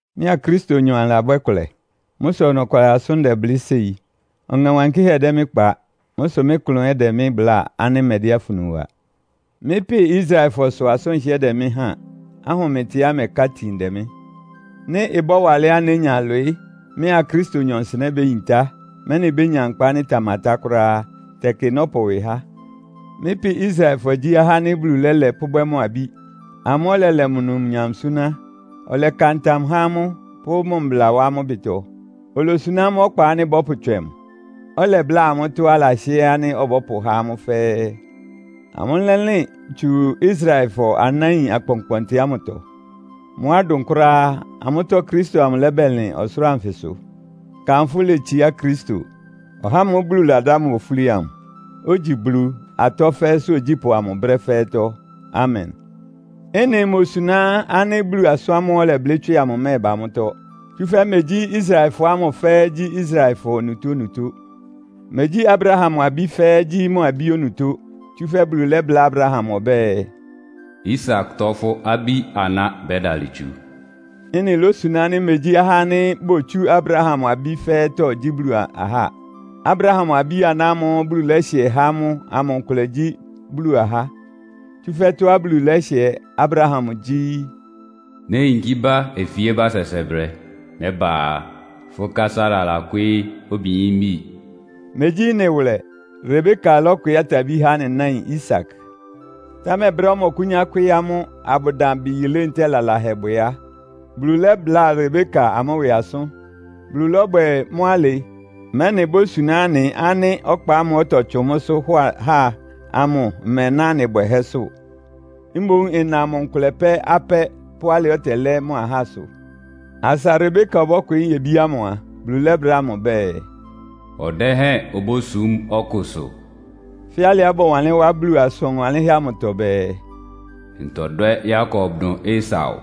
Mɩ́a Kristonyɔ anɩlabwɛ́ kʋlɛ. Mʋ́ sʋ ɔnɔkwalɩ asʋ́n ndɛblɩ́ séi. Ɔŋɛ Wankɩ́hɛ́ dɛ́ mɩ́ kpa. Mʋ́ sʋ mɩ́ klʋn ɛ́ dɛ mɩ́ bláa ánɩ́ mmɛdɛ́ afunu wa. Mɩ́ pɩ Israelfɔ sʋ asʋ́n ɩhɩ́ɛ́ dɛ mɩ́ háan, ahʋmɩtɩá ɩmɛká itin dɛ mɩ́. Nɩ́ ɩbɔ́wa alɛ́á nénya ɩlwɩɩ́, mɩ́a Kristonyɔ nsɩnɛ́ béyintá, mɛ́nɩ bénya nkpa ánɩ́ ɩtamatá kʋ́ráá á, tɛkɩ nɔ́pʋ ɩwɩ há. Mɩ́ pɩ Israelfɔ gyí ahá ánɩ́ Bulu lɛ́lɛ pʋ́bwɛ́ mʋ abí. Amʋ́ ɔlɛlɛ mʋ numnyam súná. Ɔlɛka ntam há amʋ́, pʋ́ mʋ mbla wá amʋ́ ɩbɩtɔ. Olosuná amʋ́ ɔkpa ánɩ́ bɔ́pʋtswɛ mʋ. Ɔlɛbláa amʋ́ tɔ́á alahɩ́ɛ́ ánɩ́ ɔbɔ́pʋhá amʋ́ fɛ́ɛ́. Amʋ́ lɛ́lɩn tsu Israelfɔ anáin akpɔnkpɔntɩ ámʋtɔ. Mʋ́á ɩdʋn kʋ́ráá á, amʋ́tɔ́ Kristo amʋ lɛ́bɛlɩn ɔsʋlʋ́ʋ anfɩsʋ. Kanfʋ́ letsiá Kristo, (ɔhá ámʋ́ʋ́ Bulu ladá mʋ ofúli amʋ), ogyi Bulu, atɔ́ fɛ́ɛ́sʋ́ ogyípʋ́ amʋ brɛ́ fɛ́ɛ́tɔ́! Amen! Ɩ́nɩ imosuná ánɩ́ Bulu asʋ́n ámʋ́ʋ́ ɔlɛblɩ́ tswɩ amʋ ɩmɛ́ɛba mʋ́tɔ́. Tsúfɛ́ megyí Israelfɔ ámʋ fɛ́ɛ́ gyí Israelfɔ onutónutó. Megyí Abraham abí fɛ́ɛ́ gyí mʋ abí onutó. Tsúfɛ́ Bulu lɛ́bláa Abraham ɔbɛ́ɛ, “Isaktɔ fʋ́ abí-aná bɛ́dalɩ tsu.” Ɩ́nɩ lósuná ánɩ́ megyí ahá ánɩ́ botsú Abraham abí fɛ́ɛ́tɔ́ gyí Bulu ahá. Abraham abí-aná ámʋ́ʋ́ Bulu lɛ́hɩɛ há mʋ amʋ nkʋlɛ gyí Bulu ahá. Tsúfɛ́ tɔ́á Bulu lɛ́hɩɛ Abraham gyí, “Néyinkí bá ofíébá sɛsɛbrɛ. Nɛ́ba a, fʋ́ ká Sara lakwɩ́ɩ́ obiyímbi.” Megyí ɩ́nɩ wʋlɛ. Rebeka lɔ́kwɩɩ́ atabí há anɩ náin Isak. Támɛ brɛ́á ɔmɔkʋ́nyá kwɩ́ɩ́ amʋ́, abʋdan bɩ yilé ntɛ́ɛ lalahɛbwɛ á, Bulu lɛ́bláa Rebeka amʋ́ ɩwɩ asʋ́n. Bulu lɔ́bwɛ mʋ́ alɩ, mɛ́nɩ ibósuná anɩ ánɩ́ ɔkpa ámʋ́ʋ́ ɔtɔtsʋn mʋ́sʋ́ hɔ ahá ámʋ ɩmɛná anɩ bwɛhɛ́sʋ́. Mboún ɩna mʋ nkʋlɛ pɛ́ apɛ́ pʋ́ alɩá ɔtɛlɛ́ mʋ ahásʋ. Asa Rebeka ɔbɔ́kwɩɩ́ nyebí ámʋ a, Bulu lɛ́bláa mʋ ɔbɛ́ɛ, “Ɔdɛ́hɛn obósum ɔkʋsʋ.” Fɛ́ alɩá bɔwanlɩ́n wá Bulu asʋn wanlɩ́nhɛ́ amʋtɔ bɛɛ, “Ntɔdwɛ́ Yakob dʋn Esau.”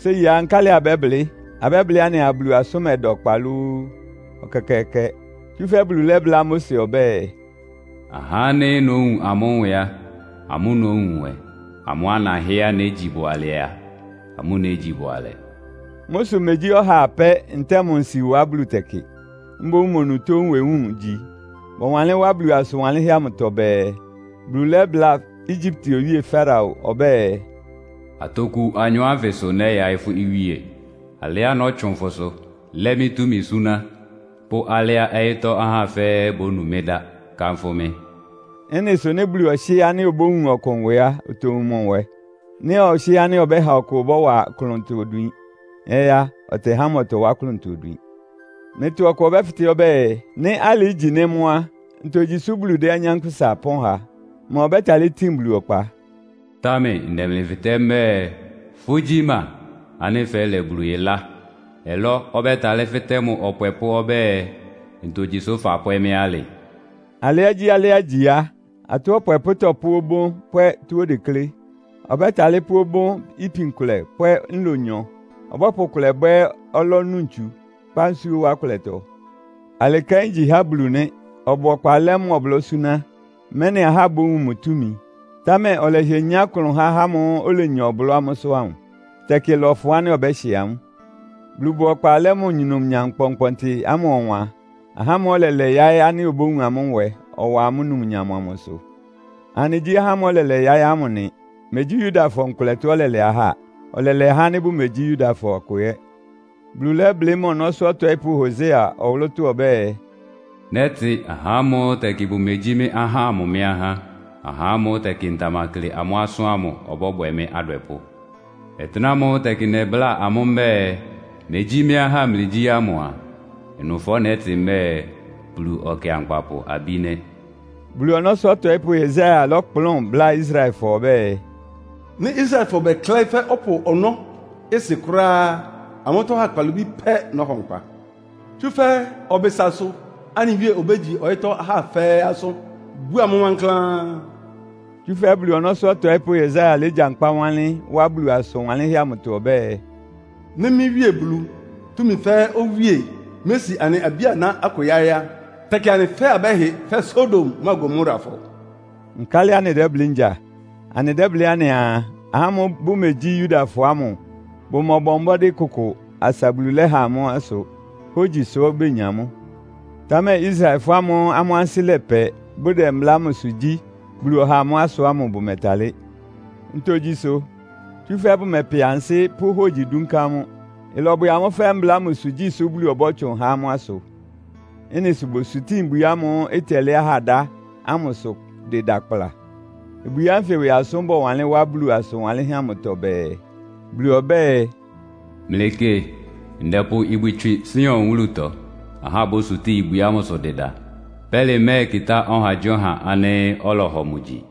Séi á, nkálɩ abɛ́blɩ́? Abɛ́blɩ́ anɩaa, Bulu asʋ́n mɛda ɔkpa lóó? Ɛkɛkɛɛkɛ! Tsúfɛ́ Bulu lɛ́bláa Mose ɔbɛ́ɛ, “Ahá ánɩ́ nówun amʋ́ nwɛ á, amʋ́ nówun nwɛ. Amʋ́á nahɩ́ɛ́á négyi bʋalɛ a, amʋ́ négyi bʋalɛ.” Mʋ́ sʋ megyí ɔha apɛ́ ntɛ́ɛ mʋ nsiwa Bulu tɛkɩ. Mboún mʋ onutó nwewúun igyi. Bɔwanlɩ́n wá Bulu asʋn wanlɩ́nhɛ́ amʋtɔ bɛɛ, Bulu lɛ́bláa Egyipte owíe Farao ɔbɛ́ɛ, “Atoku anyɔ ánfɩ sʋ nɛyaɩ́ fʋ́ iwíe, alɩá nɔ́tsʋn fʋsʋ lɛ́ mɩ́ túmi súná, pʋ́ alɩá ɔyɩ́tɔ́ ahá fɛ́ɛ́ bónu mɩ́ dá, kanfʋ́ mɩ́.” Ɩ́nɩ sʋ nɩ́ Bulu ɔhɩ́ɛ́ ánɩ́ obówun ɔkʋ nwɛ á, otowun mʋ nwɛ. Nɩ́ ɔhɩ́ɛ́ ánɩ́ ɔbɛ́ha ɔkʋ ɔbɔ́wa klʋntɔ odwin ɛ́ á, ɔtɛhá mʋ ɔtɔwá klʋntɔ odwin. Mlɩtɔ ɔkʋ ɔbɛ́fɩtɛ́ ɔbɛ́ɛ, “Nɩ́ alɩ igyi nɩ́ mʋ́ á, ntogyi sʋ́ Bulu dɛ́ nyankpʋsa ɩpɔ́n ha? Ma ɔbɛ́talɩ́ tin Bulu ɔkpa?” Támɛ ndɛ mlɩ fɩtɛ́ mbɛ́ɛ, fʋ́gyi ma ánɩ́ fɛ́lɛ Bulu ɩlá? Ɔlɔ́ ɔbɛ́talɩ́ fɩtɛ́ mʋ ɔpwɛpʋ́ ɔbɛ́ɛ, “Ntogyi sʋ fapwɛ́ mɩ́ alɩ?” Alɩágyíalɩ́á igyi á, atɔ́ ɔpwɛpʋ́ tɔ́pʋ́ obón pwɛ́ tɔ́á odeklé. Ɔbɛ́talɩ́ pʋ́ obón ipin kʋlɛ pwɛ́ nlonyɔ. Ɔbɔ́pʋ kʋlɛ bwɛ́ ɔlɔ́ nu ntsu, kpá nsúó wá kʋlɛtɔ. Alɩ kɛ́n igyi há Bulu nɩ́. Ɔbʋ ɔkpa lɛ́ mʋ ɔblɔ́ súná, mɛ́nɩ ahá bówun mʋ túmi. Támɛ ɔlɛhɩɛ nyá klʋn há ahá ámʋ́ʋ́ olenya ɔblɔ́ amʋ́sʋ́ amʋ. Tɛkɩ ɩlɔfʋn ánɩ́ ɔbɛ́hɩ amʋ́. Bulu bʋ ɔkpa lɛ́ mʋ numnyam kpɔnkpɔntɩ ámʋ ɔwan ahá ámʋ́ʋ́ ɔlɛlɛ yáɩ́ ánɩ́ obówun amʋ́ nwɛ, ɔwa amʋ́ numnyam amʋsʋ. Anɩgyí ahá ámʋ́ʋ́ ɔlɛlɛ yáɩ́ ámʋ nɩ. Megyí Yudafɔ nkʋlɛtɔ ɔlɛlɛ ahá. Ɔlɛlɛ ahá ánɩ́ bʋmegyí Yudafɔ akʋ ɛ́. Bulu lɛ́blɩ́ mʋ ɔnɔ́sʋ́ ɔtɔɩ́pʋ́ Hosea ɔwʋlʋ́tɔ́ ɔbɛ́ɛ, “Nɛ́tɩ ahá ámʋ́ʋ́ tɛkɩ bʋmegyí mɩ́ ahá ámʋ mɩ́ ahá. Ahá ámʋ́ʋ́ tɛkɩ ntamakle amʋ́ asʋ́n ámʋ ɔbɔ́bwɛ mɩ́ adwɛpʋ́. Ɔtɩ́nɛ́ ámʋ́ʋ́ tɛkɩ nɛbláa amʋ́ mbɛ́ɛ, ‘Megyí mɩ́ ahá mlɩgyí’ ámʋ a, ɩnʋfɔ nɛ́tɩ mbɛ́ɛ, ‘Bulu Ɔkɩankpapʋ abí’ nɩ́.” Bulu ɔnɔ́sʋ́ ɔtɔɩ́pʋ́ Yesaia lɔ́kplʋn bláa Israelfɔ ɔbɛ́ɛ, “Nɩ́ Israelfɔ bɛklɛ́ɩ́ fɛ́ ɔpʋ ɔnɔ́ ɩsɩ kʋ́ráá á, amʋ́tɔ́ ahá kpalobí pɛ́ nɔ́hɔ nkpa. Tsúfɛ́ ɔbɩsasʋ anɩ Wíe obégyi ɔyɩ́tɔ́ ahá fɛ́ɛ́ asʋ́n, búa mʋ́ wankláán.” Tsúfɛ́ Bulu ɔnɔ́sʋ́ ɔtɔɩ́pʋ́ Yesaia légyankpá wanlɩ́n wá Bulu asʋn wanlɩ́nhɛ́ amʋtɔ ɔbɛ́ɛ, “Nɩ́ mɩ́ Wíe Bulu, túmi fɛ́ɛ́ Owíe mési anɩ abí-aná akʋ yáɩ́ á, tɛkɩ anɩ fɛ́ɛ́ abɛ́hɩ fɛ́ Sodom mʋ́a Gomorafɔ.” Nkálɩ anɩdɛ́blɩ́ ngya? Anɩdɛ́blɩ́ anɩaa, ahá ámʋ́ʋ́ bʋmegyí Yudafɔ ámʋ bʋmɔbɔ mbɔ́dɩ́ kʋkʋ, asa Bulu lɛ́ha amʋ́ asʋ! Hógyi sʋ́ benya mʋ́. Támɛ Israelfɔ ámʋ́ʋ́ amʋ́ ansɩ́ lɛpɛ, bʋdɛ mbla ámʋsʋ gyí, Bulu ɔha amʋ́ asʋ ámʋ bʋmɛtalɩ́. Ntogyi sʋ? Tsúfɛ́ bʋmɛpɛ ansɩ́ pʋ́ hógyi dúnká mʋ́. Ɩlɔbwɛ amʋ́ fɛ́ mbla ámʋsʋ gyísʋ Bulu ɔbɔ́tsʋn ha amʋ́ asʋ. Ɩ́nɩ sʋ bosutíin “Ibwi ámʋ́ʋ́ ɩtɛlɛ́ ahá dá” ámʋsʋ dɩda kpla. Ibwi ánfɩ ɩwɩ asʋ́n bɔwanlɩ́n wá Bulu asʋn wanlɩ́nhɛ́ amʋtɔ bɛɛ, “Bulu ɔbɛ́ɛ, ‘Mlɩkɩ! Ndɛpʋ Ibwi tswɩ Sion wúlutɔ. Ahá bósutíin ibwi ámʋsʋ dɩda. Pɛ́lɩ mɛ́ɛkɩtá ɔhagyíɔha ánɩ́ ɔlɔhɔ mʋ gyi.’”